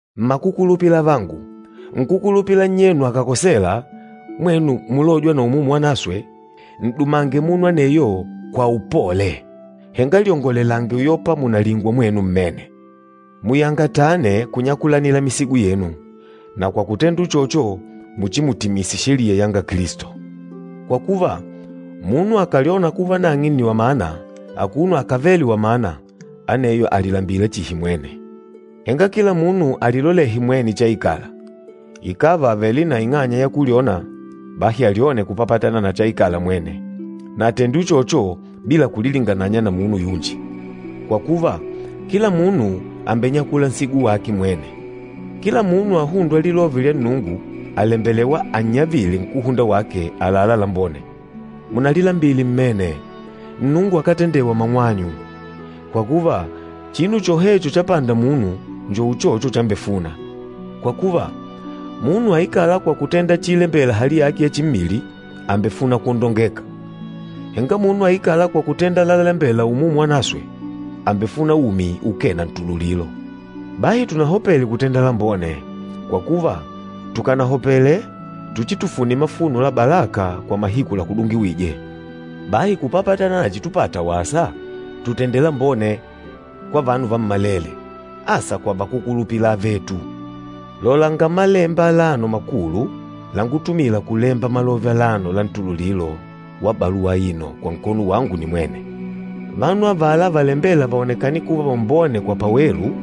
Mmakukulupila avangu, nkúkulupila nnyenu akàkosela, mwenu mulôjwa na Umumu Wanaswe, n'dumange munu aneyo kwa upole. Henga lyongolelange uyopa mùnalingwa mwenu mmene. Muyangatane kunyakulanila misigo yenu, na kwa kutenda uchocho muchimutimise sheliya yanga Kilisto. Kwa kuva, munu akàlyona kuva nang'e nni wamana, akuno akávele wamana, aneyo àlilambila chihi mwene. Henga kila munu alilolehe mwene chaikala. Ikàva àvele na ing'anya ya kulyona, bahi alyone kupapatana na chaikala mwene, na atende uchocho bila kulilingananya na munu yunji. Kwa kuva, kila munu àmbenyakula nsigo wake mwene. Kila munu ahûndwa lilove lya Nnungu àlembelewa annyavile nkúhunda wake àlalá lambone. Munalilambile mmene, Nnungu akátendewa mang'wanyu. Kwa kuva, chinu chohecho chapanda munu njo uchocho chambefuna. Kwa kuva, munu aikâla kwa kutenda chiilembela hali yake ya chimmili, àmbefuna kwondongeka. Henga munu aikâla kwa kutenda lalalembela Umumu Wanaswe, àmbefuna umi ukee na ntululilo. Bahi tunahopele kutenda lambone, kwa kuva tukanahopele tuchitufune, mafuno la balaka kwa mahiku lakúdungiwije. Bahi kupapatana na chitupata wasa, tutende lambone kwa vanu vammalele, asa kwa vakúkulupila avetu. Lolanga malemba alano makulu langutumila kulemba malove alano la ntululilo wa baluwa aino kwa nkono wangu nimwene. Vanu avala valembêla vaonekane kuva vambone kwa pawelu,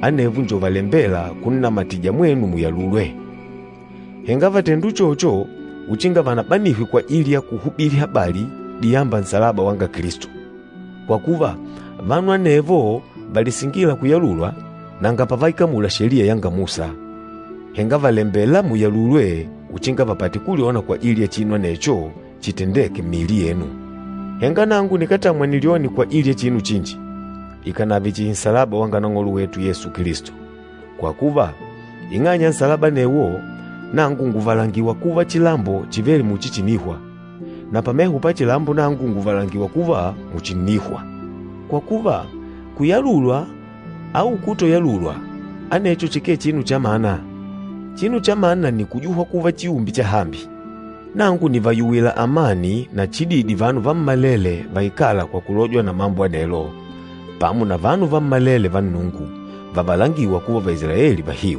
anevo njo valembêla kunnamatija mwenu muyalulwe. Henga vàtenda uchocho uchinga vanabanihwe kwajili ya kuhubili habali diyamba nsalaba wanga Kilisto. Kwa kuva, vanu anevo valisingîla kuyalulwa, nanga pavaikamula Sheliya yanga Musa, henga vàlembela muyalulwe uchinga vapate kulyona kwajili ya chinu anecho chitendeke mmiili yenu. Henga nangu nikátamwa nilyone kwajili ya chinu chinji, ikànave chihi nsalaba wa Nang'olo wetu Yesu Kilisto. Kwa kuva, ing'anya ya nsalaba anewo, nangu ngùvalangila kuva chilambo chìvele muchi chìnihwa, na pameho pa chilambo nangu ngùvalangiwa kuva muchi ǹnihwa. Kwa kuva, kuyalulwa au kutoyalulwa anecho chikee chinu chamana, chinu chamana nni kujuhwa kuva chiumbe chahambi. Nangu nìvayuwila amani na chididi vanu vammalele vaikâla kwa kulojwa na mambo anelo, pamo na vanu vammalele va Nnungu, vavalangîwa kuva Vaisilaeli vahiu.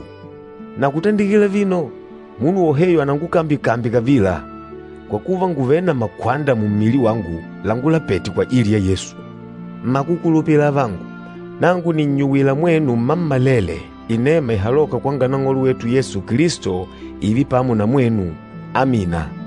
Na kutandikila vino, munu woheyo anangukambyekambye kavila, kwa kuva ngùvele na makwanda mummili wangu langulapete kwajili ya Yesu. Mmakukulupila avangu, nangu nìnnyuwila mwenu mmammalele inema ihalôka kwanga Nang'olo wetu Yesu Kilisto, ììve pamo na mwenu. Amina.